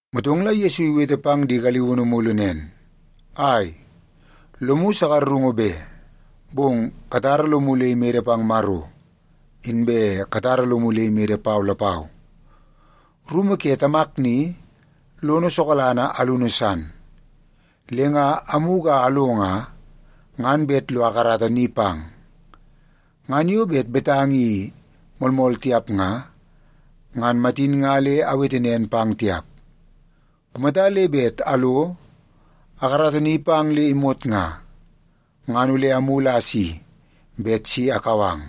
Motong la Yesu iwete pang di galiunu mulu nen, “Ai, lomu sakarungu be. Bong katara lomu le imede pang Maro, inbe katara lomu le imede pau lapau. Rumu ke Tamak ni, lono sokalanga alunu san. Le nga amugu a alo nga, ngan bet lo akarata ni pang. Ngan yo bet betanga i moolmool tiap nga, ngan matin nga le awete nen pang tiap. Kumata le bet alo akarata ni pang le imot nga, ngan ole amulu a asi bet si akau ang,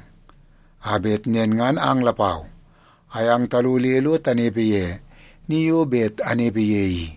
a bet nen ngan ang lapau ayang talo le lo tanepe ye ni yo bet anepe ye i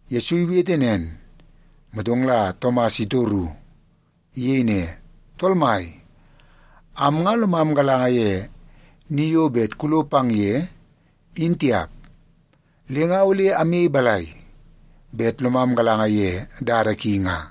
Yesu iwete nen, motong la Tomas itoru. Iyei ne, “Tool Mai, am nga lomam galanga ye ni yo bet kulo pang ye, in tiap. Le nga ole amyei balai bet lomam galanga ye dada ki nga?”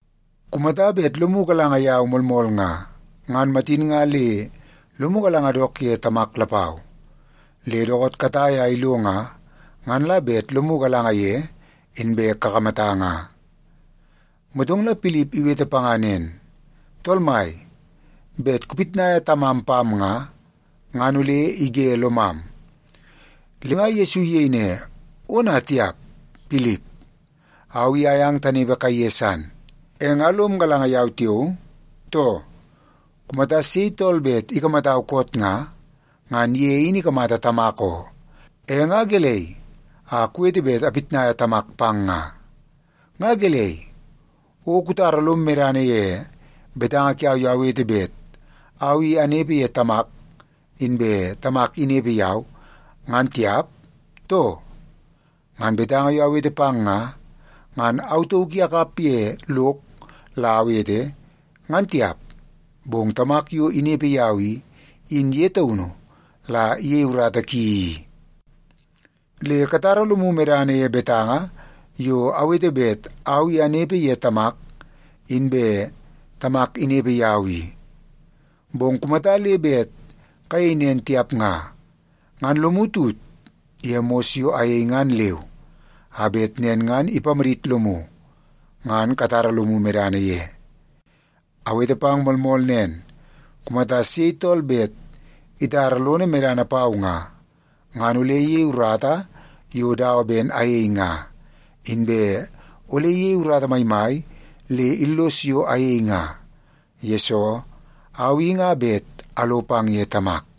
Kumata bet lomu galanga yau moolmool nga, ngan matin nga le lomu galanga dook ye Tamak lapau. Le dookoot katai a ilo nga, ngan la bet lomu galanga ye, inbe kakamata nga.” Motong la Pilip iwete panga nen, “Tool Mai, bet kupitnaia Tamam pam nga, ngan ole ige lomam.” Le nga Yesu iyei ne, “Ona tiap! Pilip, au i ayang tanepe kaiye san, e nga lom galanga yau tiao, too? Kumata sei tool bet ikamatau koot nga, ngan ye in ikamata Tamak oo. E nga gelei a kuwete bet apitnaia Tamak pang nga? Nga gelei, o kutara lom medana ye betanga kiau yo awete bet au i anepe ye Tamak, inbe Tamak inepe yau, ngan tiap, too? Ngan betanga yo awete pang nga, ngan au tauk i akap ye lok la awete, ngan tiap, bong Tamak yo inepe yau i, in ye taunu la iyei urata ki i. Le katara lomu medana ye betanga yo awete bet au i anepe ye Tamak, inbe Tamak inepe yau i. Bong kumata le bet kayei nen tiap nga, ngan lomu tut ye mos yo ayei ngan leu, a bet nen ngan ipamadit lomu ngan katara lomu medana ye. Awete pang moolmool nen, kumata sei tool bet itara lono medana pau nga, ngan ole iyei urata yo dawa ben ayei nga. Inbe ole iyei urata maimai le illos yo ayei nga, yesoo au i nga bet alo pang ye Tamak.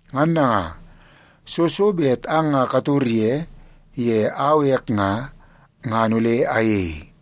Ngan nanga, soo so bet ang nga kator ye, ye au ek nga, ngan ole ayei.”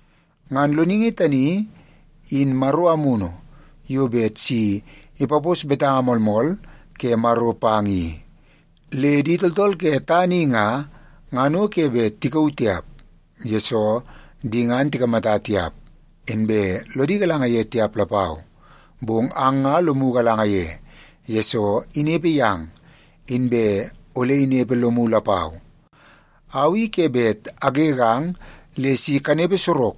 Ngan Loningi tani in Maro Amunu yo bet si ipapos betanga moolmool ke Maro pang i. Le di tooltool ke tana i nga, ngan o ke bet tikauu tiap, yesoo di ngan tikamata tiap, inbe lodi galanga ye tiap lapau. Bong ang nga lomu galanga ye, yesoo inepe yang, inbe ole inepe lomu lapau. Au i ke bet agegang le si kanepe sorok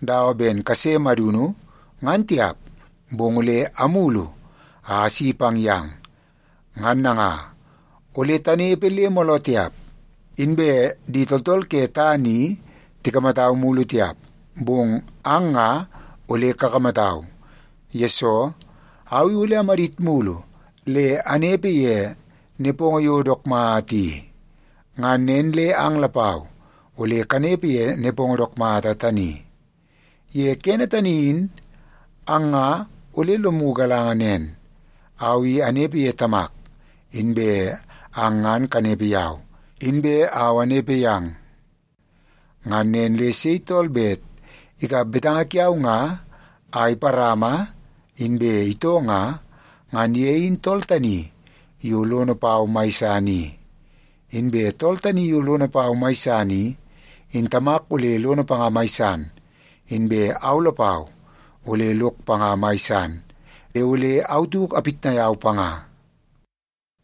dawa ben kase madunu, ngan tiap, bong ole amulu a asi pang yang. Ngan nanga, ole tanepe le mooloo tiap, inbe di tooltool ke tana i tikamatau mulu tiap, bong ang nga ole kakamatau, yesoo, au i ole amadit mulu le anepe ye nepongo yo dook mata i. Ngan nen le ang lapau ole kanepe ye nepongo dook mata tani. Ye kene tani in ang nga ole lomu galanga nen, au i anepe ye Tamak, inbe ang ngan kanepe yau, inbe au anepe yang. Ngan nen le sei tool bet ikap betanga kiau nga a iparama, inbe itoo nga, ngan ye in tool tani yo lono pau mai san i. Inbe tool tani yo lono pau mai san i, in Tamak ole lono panga mai san. Inbe au lapau ole lok panga mai san, le ole au tauk apitnai au panga.”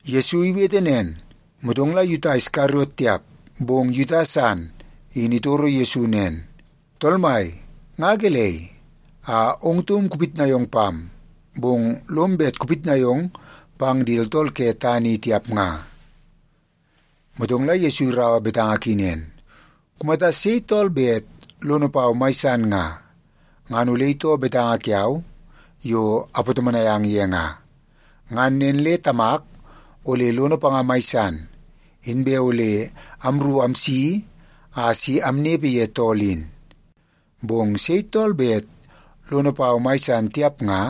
Yesu iwete nen, motong la Yuta Iskariot tiap, bong Yuta san in itoro Yesu nen, “Tool Mai, nga gelei a ong taum kupitnai ong pam, bong lom bet kupitnai ong pang di tooltool ke tana i tiap nga?” Motong la Yesu iraua betanga ki nen, “Kumata sei tool bet lono pau mai san nga, ngan ole itoo betanga kiau yo apatomonai ang ye nga. Ngan nen le Tamak ole lono panga mai san, inbe ole amru amsi a si amnepe ye tool in. Bong sei tool bet lono pau mai san tiap nga,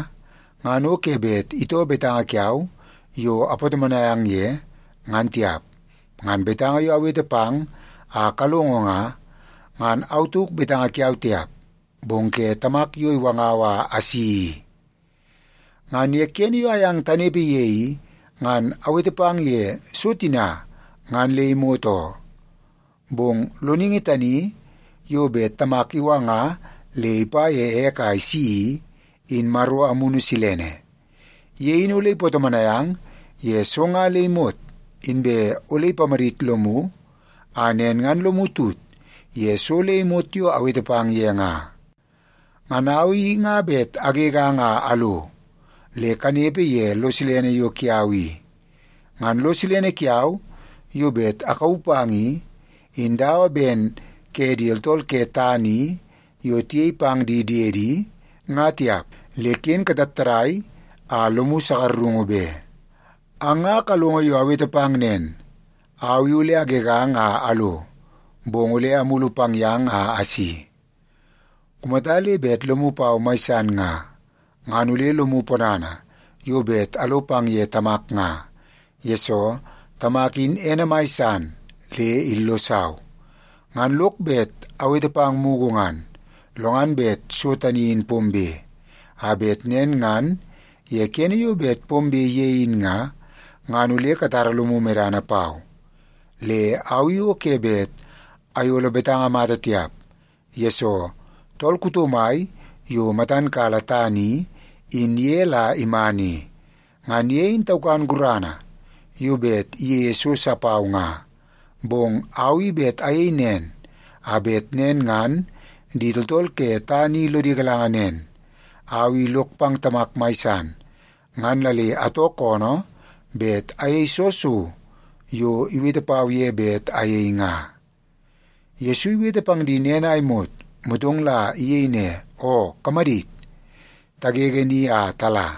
ngan ke bet itoo betanga kiau yo apatomonai ang ye, ngan tiap. Ngan betanga yo awete pang a kalongo nga, ngan au tauk betanga kiau tiap, bong ke Tamak yo iwangau a asi i. “Ngan ye kene yo ayang tanepe ye i, ngan awete pang ye so tina ngan le imot oo. Bong Loningi tani yo bet Tamak iwanga le ipa ye ek a isi i, in Maro Amunu Silene. Ye in ole ipatomonai ang ye so nga le imot, inbe ole ipamadit lomu a nen ngan lomu tut ye so le imot yo awete pang ye nga. Ngan au i nga bet agegang a alo, le kanepe ye lo silene yo kiau i. Ngan lo silene kiau yo bet akauu pang i, in dawa ben ke di tooltool ke tana i yo tiyei pang di diedi, nga tiap. Le ken katattadai a lomu sakarungu be. “Ang nga kalongo yo awete pang nen, ‘Au i ole agegang a alo, bong ole amulu pang yang a asi.’ Kumata le bet lomu pau mai san nga, ngan ole lomu ponana yo bet alo pang ye Tamak nga, yesoo Tamak in ene mai san le illosau. Ngan lok bet awete pang mugu ngan, lo ngan bet so tani in pombe, a bet nen ngan ye kene yo bet pombe ye in nga, ngan ole katara lomu medana pau. Le au i o ke bet ayolo betanga mata tiap, yesoo tool kuto mai yo matan kala tana i, in ye la iman i. Ngan ye in taukan gurana yo bet iyeie so sa pau nga. Bong au i bet ayei nen a bet nen ngan di tooltool ke tana i lodi galanga nen, au i lok pang Tamak mai san, ngan la le atoo koonoo bet ayei soo so yo iwete pau ye bet ayei nga.” Yesu iwete pang di nen a imot, motong la iyei ne, “Oo, kamadit. Tagege ni a tala.”